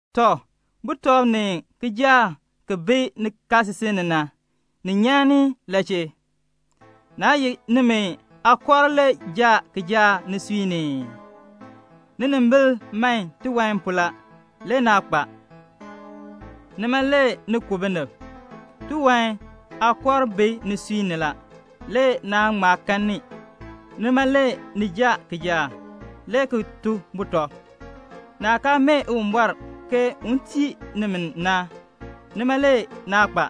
Tɔ, butɔb ni kijaak ki bi nikaasisik ni na, ni nyan ni la chee? Naa ye nimi aakɔrk le jaa kijaak nisui ni ii? Ninimbil man tiwan pu la, le naa kpa. Nima le ni ku binib. Tiwan aakɔrk bi nisui ni la, le naa ŋma kan ni, nima le ni jaa kijaak, le ki to butɔb. Naah kaa mee Uwumbɔr ke un tii nimi na, nima le naa kpa.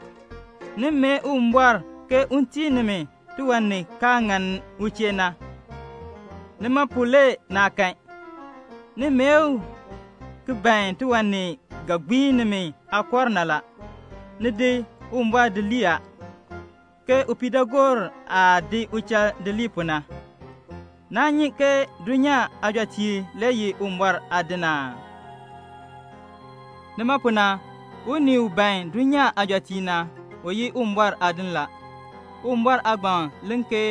Ni mee Uwumbɔr ke un tii nimi tiwan ni kaa ŋan u chee na, nima pu le naa kan. Ni mee u ki ban tiwan ni ga gbiin nimi aakɔrk na la. Ni di Uwumbɔr di lii a, ke upiidaagoor aah di uchal di lii pu na. Naa nyi ke dulnyaa aajɔteek le ye Uwumbɔr aadiŋ aa? Nima pu na, unii u ban dulnyaa aajɔteek na, u ye Uwumbɔr aadin la. Uwumbɔr aagbaŋ len ke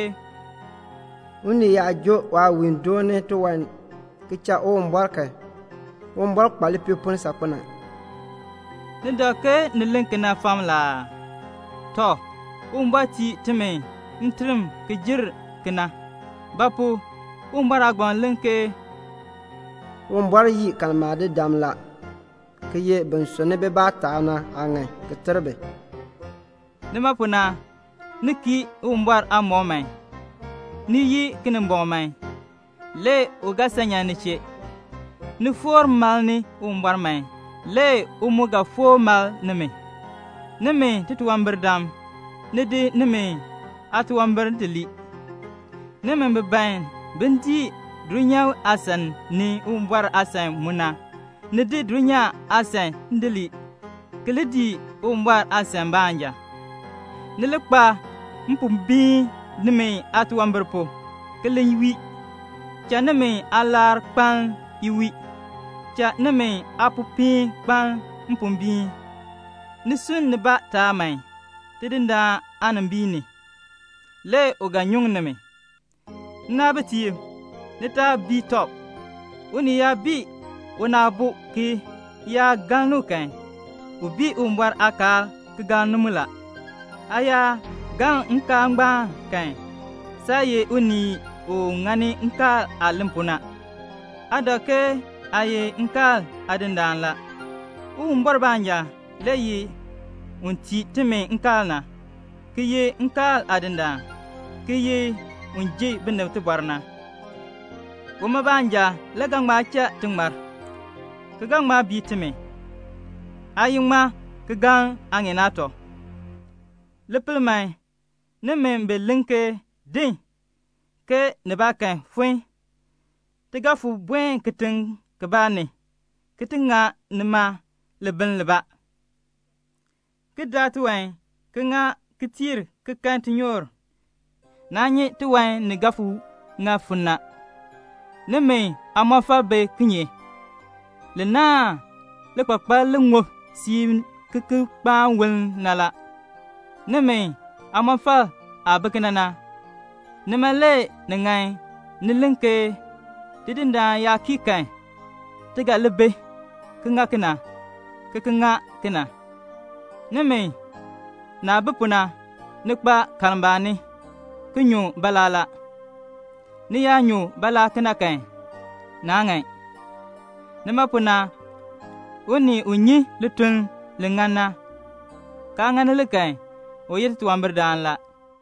"Unii yaa joo waawiin dooni tiwan ki cha Uwumbɔr kan, Uwumbɔr kpa lipiipoln saakpen a." Ni dak ke ni len kena fam la aa? Tɔ, Uwumbɔr tii timi nterm ki jer kena. Ba pu? Uwumbɔr aagbaŋ len ke "Uwumbɔr yii kalmbaanidam la, ki ye bin sunni bibaa taab na aaŋan ki ter bi." Nima pu na, ni kii Uwumbɔr aamɔb man. Ni yii Kinimbɔŋ man, le u ga san nyan ni chee. Ni foor malni Uwumbɔr man, le u mu ga foor mal nimi. Nimi titunwambirdam, ni di nimi aatunwambir di lii. Nimi bi ban bin dii dulnyaa aasan ni Uwumbɔr aasan mu na, ni di dulnyaa aasan di lii, ki li dii Uwumbɔr aasan baanja. Ni li kpa mpombiin nimi aatunwambir pu, ki li wii. Cha nimi aalar kpaln iwiil. Cha nimi aapopiin kpaln mpombiin. Ni sunn nibaa taab man Tidindaan aanimbiin ni, le u ga nyuŋ nimi. Nnaabitiib, ni taa bii tɔb. Unii yaa bii una aabo ki yaa galn u kan, u bii Uwumbɔr aakaal ki galn mu la. Aa yaa galn nkaal ngbaan kan, saa ye unii u ŋani nkaal aah len pu na, aa dak ke aa ye nkaal aadindaan la. Uwumbɔr baanja le ye un tii timi nkaal na, ki ye nkaal Aadindaan, ki ye un ji binib tibɔr na. Uma baanja le ga ŋma cha ti ŋmar, ki ga ŋma bii timi. Aa ye ŋmaa ki galn aaŋeen aatɔ? Li pel man, nimi bi len ke "Din, ke nibaakan fon, ti ga fon buen kitiŋ kibaa ni, ki ŋa libiln libaa, ki daa tiwan, ki ŋa ki kooh, ki kan tinyoor," naa nyi tiwan ni ga fon ŋa fon na. Nimi aamɔfal bi kinye? Li naahn likpakpal li ŋub siib ki ki kpaan woln na la. Nimi aamɔfal aah bi kena na, nima le ni ŋan ni len ke "Tidindaan yaa kii kan, ti ga li bi, ki ŋa kena, ki ki ŋa kena." Nimi, naah bi pu na, ni kpa kalmbaani ki nyu baalaa la. Ni yaa nyu baalaa kena kan, naa ŋan. Nima pu na, unii u nyi lituln li ŋan na, kaa ŋani li kan, u ye titunwambirdaan la.